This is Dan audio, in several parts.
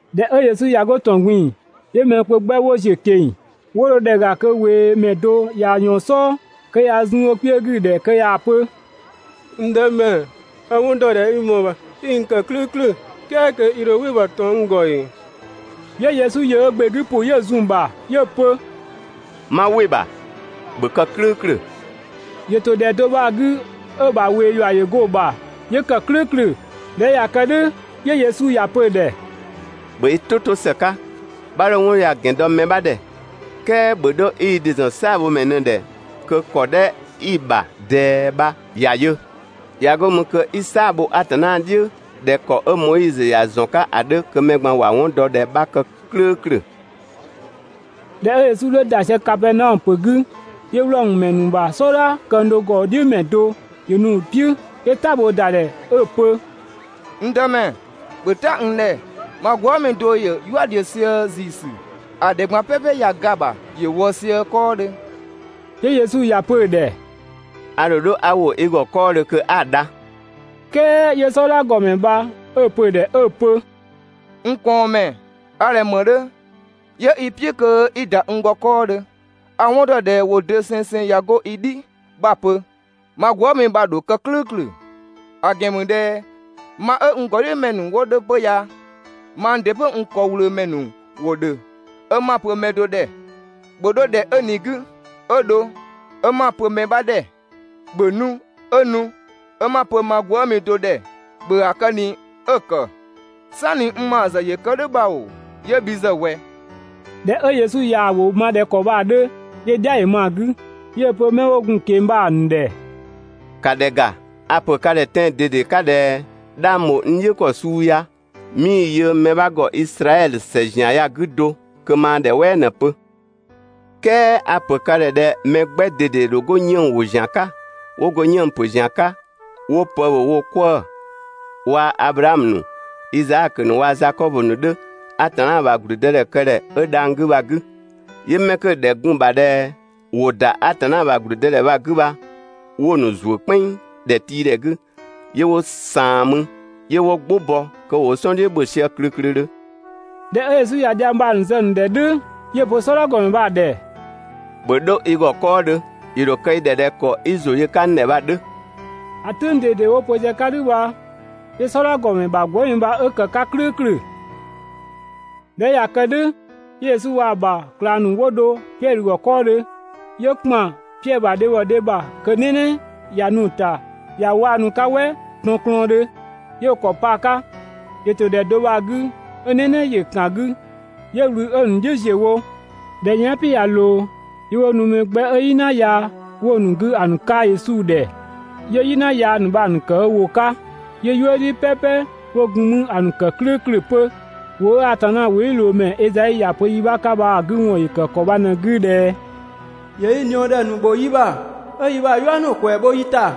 ꞊Dhɛ 'ö Yesu ꞊ya 'go ‑tɔn ꞊gbin‑, 'yö mɛ kpö 'gbɛ 'wo ‑ziö ꞊keng‑. 'Wo dho ‑dhɛ ‑ga kö ꞊weemɛ do ꞊ya ꞊yɔɔn‑ "sɔɔ kö ꞊ya zun ö kpiö 'gü‑ ‑dhɛ, kö ꞊yaa‑ pö: «N Dëmɛ, a‑ 'wɔn ‑dɔ ꞊dhɛ i ‑mɔɔ ‑bha 'i n ‑kë "klʋ̈ʋ̈klʋ̈, "kɛɛ kö i ‑dho "wɩ‑ ‑bha ꞊tɔn n ‑gɔ ‑ee?» 'Yö Yesu ‑yö ö ‑gbe 'gü ‑pʋ 'yö‑ zun‑ ‑bha 'yö‑ pö: «'Ma "wɩ‑ ‑bha, ‑bhö kë "klʋ̈ʋ̈klʋ̈!» ‑Yö ‑to ‑dhɛ do bha‑ 'gü, 'ö‑ ‑bha ꞊wee ‑yua ‑yö go‑ ‑bha 'yö kë "klʋ̈ʋ̈klʋ̈. ꞊Dhɛ 'ö ꞊ya kë "dhʋ̈, 'yö Yesu ‑ya pö‑ ‑dhɛ: «‑Bhö i "tʋ 'to ‑së 'ka, 'bha 'dho 'wɔn ya‑ ‑gɛn do mɛ 'bha ‑dhɛ, "kɛɛ ‑bhö 'dho 'i i ‑dɩ ‑zɔn "saabhomɛ ꞊në‑ ‑dhɛ kö ‑kɔ 'dhɛ 'i‑ ‑bha ꞊dɛɛ bha ‑ya yö! ꞊Ya 'go mü kö 'i "saa‑ bho Atanna "dhiʋ̈ ꞊dhɛ ‑kɔ 'ö Moizö ‑ya ‑zɔn 'ka ‑a 'dhö kö mɛ ꞊gban ‑wa 'wɔn dɔ ꞊dhɛ 'bha kë "klʋ̈ʋ̈klʋ̈.» ꞊Dhɛ 'ö Yesu 'dhö ‑da sië Kapɛɛnaɔmö ‑pö 'gü, 'yö Wlɔmö ‑mɛ ‑nu ‑bha "sɔdha këng do ‑gɔdhiʋ̈mɛ do ‑yö nu‑ "piʋ̈, 'yö "ta bhoo ‑da ‑dhɛ 'ö‑ pö: «N Dëmɛ, ‑bhö "ta n ‑dhɛ, ma gwëëmi do ‑yö "yua "dhiʋ̈ sië ‑ziisü, ‑a ‑dhɛ ꞊gban "pɛpɛ ꞊ya ga‑ ‑bha, ‑yö wɔ sië 'kɔɔdhö.» 'Yö Yesu ‑ya pö‑ ‑dhɛ: «A ‑dho 'dho 'a ‑wo i ‑gɔ 'kɔɔdhö kö 'a‑ dha.» "Kɛɛ 'yö "sɔdha ‑gɔmɛ bha 'ö‑ pö‑ ‑dhɛ 'ö‑ pö: «N ꞊kɔɔnmɛ, a ꞊dhɛ ‑më 'dhö 'yö 'i‑ "piʋ̈ kö 'i ‑da n ‑gɔ 'kɔɔdhö, a‑ 'wɔn ‑dɔ ꞊dhɛ ‑wʋ dosengseng ‑ya 'go i "dhi 'bha‑ pö, ma gwëëmi bha‑ ‑dho kë "klʋ̈ʋ̈klʋ̈; ‑a ‑gɛn ‑mü ꞊dhɛ ma 'ö n ‑gɔdhiʋ̈mɛ ‑nu 'wo 'dhö 'pö ya, mang ‑dɩ 'pö n ‑kɔwlöömɛ ‑nu ‑wo ‑dhö 'ö 'ma‑ pö mɛ do ‑dhɛ: ‹‑Bhö 'dho ‑dhɛ 'ö ꞊ni‑ 'gü!› 'ö dho 'ö 'ma‑ pö‑ mɛ 'bha ‑dhɛ: ‹‑Bhö nu!› 'ö nu, 'ö 'ma‑ pö ma gwëëmi do ‑dhɛ: ‹‑Bhö ‑a kë ꞊ni!› 'ö‑ ‑kë. ("Sanni n ‑bha ‑zë ‑yö kë "dhʋ̈ bha ‑oo, 'yö bhi ‑zë ꞊wɛ?)» ꞊Dhɛ 'ö Yesu ꞊yaa‑ ‑wʋ ma ꞊dhɛ ‑kɔ bha‑ 'dhö, 'yö‑ "dhia ‑yö ma‑ 'gü, 'yö‑ pö 'mɛ 'wo gun‑ ꞊keng‑ bha‑ ‑nu ‑dhɛ: «‑Ka ‑dhɛ ‑ga, a‑ ‑pö ka ‑dhɛ tɛan‑ ꞊dede 'ka ꞊dhɛ 'dhang ‑bho n "dhiʋ̈ ‑kɔ suu ya, 'mii‑ yö mɛ 'bha ‑gɔ Izraɛdhö ‑sɛ ‑zian ya‑ 'gü do kö maa ‑dhɛ "wɛɛ ꞊në‑ pö!» "Kɛɛ a‑ ‑pö ka ‑dhɛ ꞊dhɛ mɛ 'gbɛ ꞊dede ‑dho 'go 'yënng‑ ‑wo ‑zian 'ka, 'wo go 'yënng‑ ‑pö ‑zian 'ka 'wo pë ‑bhö wo 'kwëë‑ waa‑ Ablaamö ‑nu, Izaakö ‑nu waa‑ Zakɔbö ‑nu 'dhö Atanna ‑bha ‑gblüdëdhɛkëdhɛ 'ö dhang‑ 'gü bha‑ 'gü. 'Yö 'mɛ 'kö‑ ‑dhɛ gun‑ ‑bha ‑dhɛ ‑wo ‑da Atanna ‑bha ‑gblüdëdhɛkëdhɛ bha‑ 'gü bha 'wo‑ ‑nu ‑zuö "kpɛnng ‑dhɛtiidhɛ 'gü, ('yö 'wo ꞊saan mü,) 'yö 'wo "gbʋ bɔ kö ‑wo wo "sɔn "dhiʋ̈ ‑bhö sië klöklödhö.» ꞊Dhɛ 'ö Yesu ꞊ya dhiang bha‑ zë‑ ‑nu ‑dhɛ "dhʋ̈, 'yö‑ pö "sɔdha ‑gɔmɛ bha‑ ‑dhɛ: «‑Bhö 'dho i ‑gɔ 'kɔɔdhö, ‑yö ‑dho kë i ‑dhɛ ꞊dhɛ ‑kɔ 'i ‑zʋ yö‑ 'ka n ‑dhɛ bha‑ 'dhö!» ‑A "tʋ̈ng ꞊dede 'wo‑ pö sië‑ 'ka "dhʋ̈ bha, 'yö "sɔdha ‑gɔmɛ ‑bha gwëëmi bha 'ö ‑kë 'ka "klʋ̈ʋ̈klʋ̈. ꞊Dhɛ 'ö ꞊ya kë "dhʋ̈, 'yö Yesu waa‑ ‑bha ꞊klang ‑nu 'wo dho Piɛdhö ‑gɔ 'kɔɔdhö. 'Yö ‑kpan Piɛdhö ‑bha dhebhɔ dhe ‑bha kö "nɛnɛ ꞊ya nu‑ ‑ta kö ‑yö 'waanu ‑sü 'ka‑ 'ka "wɛ tɔnklɔɔndhö. 'Yö ö ‑kɔ pa‑ ‑kɔ 'ka. ‑Yö ‑to ‑dhɛ do bha‑ 'gü 'ö "nɛnɛ ‑yö ‑kan 'gü, 'yö ꞊wlü 'ö‑ ‑nu "dhiʋ̈ ‑ziö wo. ꞊Dhɛ 'ö yɛan" "piʋ̈ ꞊ya ꞊loo, 'yö 'wo nu mɛ 'gbɛ 'ö "yina yaa ‑nu 'wo‑ ‑nu 'gü ‑a ‑nu 'ka Yesu ‑dhɛ. 'Yö "yina yaa ‑nu bha‑ ‑nu ‑kë ö ‑wʋ 'ka, 'yö "yuëdhi "pɛpɛ 'wo gun 'mü ‑a ‑nu ‑kë "klʋ̈ʋ̈klʋ̈ 'pö. ‑Wʋ 'ö Atanna ‑wʋdhiʋ̈loomɛ Ezai ‑ya pö yi 'bha 'ka bha‑ 'gü ‑wɔn ‑yö ‑kë ‑kɔ bha ꞊në‑ 'gü ꞊dhɛ: «‑Yö yi ꞊niɔɔdhɛ ‑nu ‑bho yi ‑bha, 'ö yi ‑bha "yua ‑nu ‑kwɛɛ bho yi ‑ta.»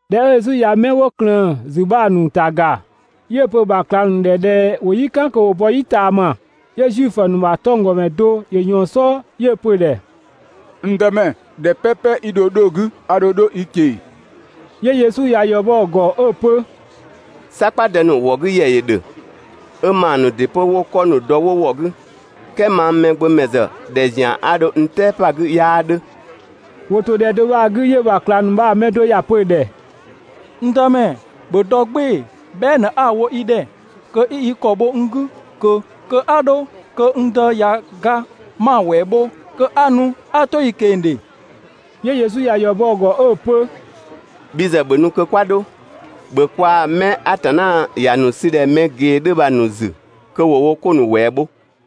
꞊Dhɛ 'ö Yesu ꞊ya 'mɛ 'wo ꞊klëën‑ ‑zü bha‑ ‑nu ‑ta ‑ga, 'yö‑ pö‑ ‑bha ꞊klang ‑nu ‑dhɛ ꞊dhɛ ‑wo "yi "kan kö ‑wo bɔ "yi ꞊taama. 'Yö Zuifö ‑nu ‑bha 'tɔnggɔmɛ do ‑yö ꞊yɔɔn‑ "sɔɔ 'yö‑ pö‑ ‑dhɛ: «N Dëmɛ, ‑dhɛ "pɛpɛ 'i dho 'dho‑ 'gü, a ‑dho 'dho i ꞊keng‑.» 'Yö Yesu ‑ya ‑yɔ bɔ‑ ‑gɔ 'ö‑ pö: «"Sakpadë ‑nu ‑wɔ 'gü ‑yɛ ‑yö ‑dhö, 'ö ‑maa ‑nu ‑dɩ 'pö 'wo 'kɔ ‑nu dɔ 'wo ‑wɔ 'gü, "kɛɛ mang Mɛgbömɛ ‑zë ‑dhɛ ‑zian 'a dho n "tɛɛ pa‑ 'gü 'yaa 'dhö. ‑Wo ‑to ‑dhɛ do bha‑ 'gü, 'yö‑ ‑bha ꞊klang ‑nu bha‑ mɛ do ‑ya pö‑ ‑dhɛ: «N Dëmɛ, ‑bhö dɔ "gbɩɩ‑ bhɛa" ꞊në 'a‑ wo i ‑dhɛ kö 'i i ‑kɔ bho n 'gü ꞊kö kö 'a 'dho, kö n dë ꞊ya ga 'ma‑ ‑wɛɛ bho kö 'a nu 'a 'to i ꞊keng‑ ‑dhe!» 'Yö Yesu ‑ya ‑yɔ bɔ‑ ‑gɔ 'ö‑ pö: «Bhi ‑zë ‑bhö nu kö 'kwa 'dho! ‑Bhö kwaa‑ 'mɛ Atanna ‑ya ‑nu ‑sü ꞊dhɛ mɛ ꞊gee 'dhö bha‑ ‑nu ‑zü kö ‑wo wo 'ko ‑nu ‑wɛɛ bho.»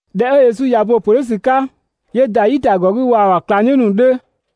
꞊Dhɛ 'ö Yesu ꞊ya bo‑ ‑pö "dhʋ̈ ‑sü 'ka, 'yö ‑da "yitagɔ 'gü waa‑ ‑bha ꞊klangdhiʋ̈ ‑nu 'dhö.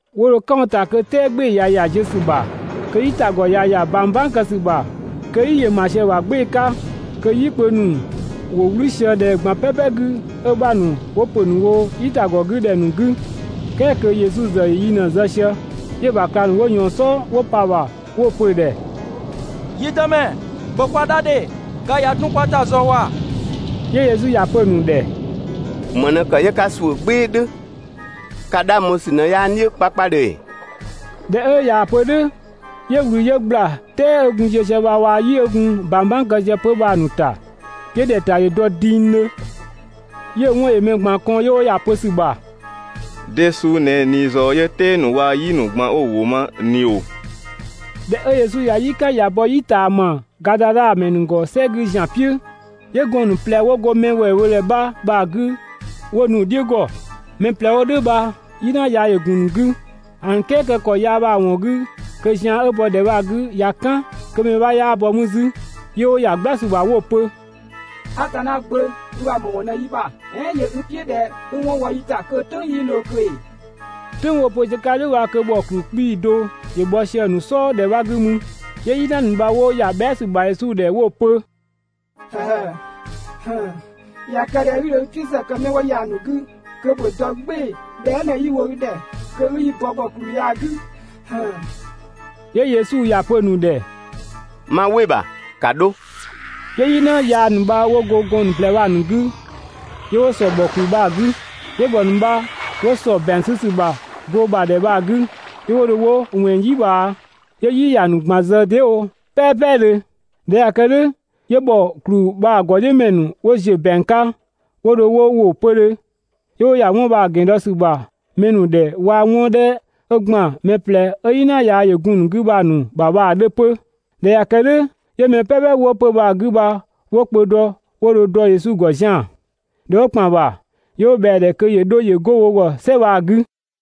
'Wo dho "kan wo ‑ta kö "tɛɛ "gbɩɩ‑ ꞊ya ‑ya ziö ‑sü ‑bha, kö "yitagɔ ꞊ya ‑ya ꞊bang "bang kë ‑sü ‑bha, kö "yi ‑yö ‑ma sië‑ ‑bha "gbɩɩ‑ 'ka, kö "yi kpö ‑nu ‑wo "wlü sië ‑dhɛ ꞊gban "pɛpɛ 'gü, 'ö‑ 'bha ‑nu 'wo ‑pö ‑nu wo "yitagɔ 'gü ‑dhɛ ‑nu 'gü, "kɛɛ kö Yesu ‑zë ‑yö yi ꞊në‑ zë sië. 'Yö‑ ‑bha ꞊klang ‑nu 'wo ꞊yɔɔn‑ "sɔɔ 'wo pa‑ ‑bha, 'yö 'wo‑ pö‑ ‑dhɛ: «Yi Dëmɛ, ‑bhö kwa dha ‑dhe, ga ꞊ya dun kwa ‑ta ꞊zɔɔ ‑wa!» 'Yö Yesu ‑ya pö‑ ‑nu ‑dhɛ: «‑Më ꞊në ‑kë 'yö 'ka ‑suʋ̈ "gbɩɩ‑ "dhʋ̈? Ka 'dhang bho ‑sü ꞊në 'yaa n "dhiʋ̈ 'kpakpadhö ‑ee?» ꞊Dhɛ 'ö ꞊yaa‑ pö "dhʋ̈, 'yö ꞊wlü 'yö ꞊gbla "tɛɛ 'ö gun ziö sië bha waa‑ "yi 'ö gun ꞊bang "bang kë sië 'pö bha‑ ‑nu ‑ta, 'yö ‑dhɛta ‑yö dɔ dingdhö. 'Yö‑ 'wɔn ‑yö mɛ ꞊gban kɔn, 'yö 'wo ‑ya pö ‑sü ‑bha: «De suu ꞊në ꞊ni ꞊zɔɔ 'yö "tɛɛ ‑nu waa‑ "yi ‑nu ꞊gban 'wo‑ ‑wʋ ma ꞊ni ‑oo?» ꞊Dhɛ 'ö Yesu ꞊ya "yi "kan ꞊ya bɔ "yi ꞊taama Gadadha ‑mɛ ‑nu ‑gɔ "sɛ 'gü ‑zian "piʋ̈, 'yö gɔɔn‑ ‑nu ꞊plɛ 'wo go mɛ ‑wɛɛbhodhɛ 'bha bha‑ 'gü 'wo nu‑ "dhiʋ̈ ‑gɔ. Mɛ ꞊plɛ 'wo "dhʋ̈ bha "yina yaa ‑yö ‑gun ‑nu 'gü, ‑a ‑nu "kɛɛkë ‑kɔ yaa bha‑ ‑wɔn 'gü kö zian 'ö bɔ ‑dhɛ bha‑ 'gü ꞊ya "kan, kö mɛ 'bha 'yaa bɔ mü 'zü. 'Yö 'wo ‑ya "gbla ‑sü ‑bha 'wo‑ pö: «Atanna Gbö, i ‑bha ‑më ‑wɔn ꞊në yi ‑bha! "Ɛɛn ‑yö i "piʋ̈ ꞊dhɛ 'i 'wɔn wɔ yi ‑ta kö‑ "tʋ̈ng 'yii ꞊loo ꞊kö ‑ee? "Tʋ̈ng 'wo‑ pö sië‑ 'ka "dhʋ̈ bha kö ‑bhɔ ‑kplü 'kpii‑ do ‑yö bhɔ sië‑ ‑nu "sɔɔ ‑dhɛ 'bha 'gü mü. 'Yö "yina ‑nu bha 'wo ‑ya bhɛa" ‑sü ‑bha Yesu ‑dhɛ 'wo‑ pö: «꞊Ya kë ꞊dhɛ 'i dho yi "piʋ̈ ‑zë kë 'mɛ 'wo ya‑ ‑nu 'gü kö ‑bhö dɔ "gbɩɩ‑ bhɛa" ꞊në 'yi‑ wo i ‑dhɛ kö 'i yi bɔ ‑bhɔ ‑kluu ya‑ 'gü!» 'Yö Yesu ‑ya pö‑ ‑nu ‑dhɛ: «'Ma "wɩ‑ ‑bha, ‑ka 'dho!» 'Yö "yina yaa ‑nu bha 'wo 'go gɔɔn‑ ‑nu ꞊plɛ bha‑ ‑nu 'gü, 'yö 'wo ‑sɔ ‑bhɔ ‑kluu bha‑ 'gü. 'Yö ‑bhɔ ‑nu bha 'wo ‑sɔ ‑bɛang 'sü ‑sü ‑bha goo ‑bha ‑dhɛ bha‑ 'gü, 'yö 'wo dho 'wo ꞊wɛnng "yi ꞊bhaa 'yö "yi ‑ya ‑nu ꞊gban zë dee" wo "pɛpɛdhö. ꞊Dhɛ 'ö ꞊ya kë "dhʋ̈, 'yö ‑bhɔ ‑kpluu bha‑ ‑gɔdhiʋ̈mɛ ‑nu 'wo ‑ziö ‑bɛang 'ka 'wo dho 'wo ‑wo 'pödhö. 'Yö 'wo ‑ya 'wɔn bha‑ ‑gɛn dɔ ‑sü ‑bha mɛ ‑nu ‑dhɛ waa‑ 'wɔn 'dhɛ 'ö ‑gban mɛ ꞊plɛ 'ö "yina yaa ‑yö gun‑ ‑nu 'gü bha‑ ‑nu ‑bha bha‑ 'dhö 'pö. ꞊Dhɛ 'ö ꞊ya kë "dhʋ̈, 'yö mɛ "pɛpɛ 'wo 'pö‑ bha‑ 'gü bha 'wo kpö dɔ 'wo dho dɔ Yesu ‑gɔ zian‑. ꞊Dhɛ 'wo ‑kpan ‑bha, 'yö 'wo ꞊bhɛa‑ ‑dhɛ kö ‑yö 'dho ‑yö 'go wo ‑gɔ "sɛ bha‑ 'gü.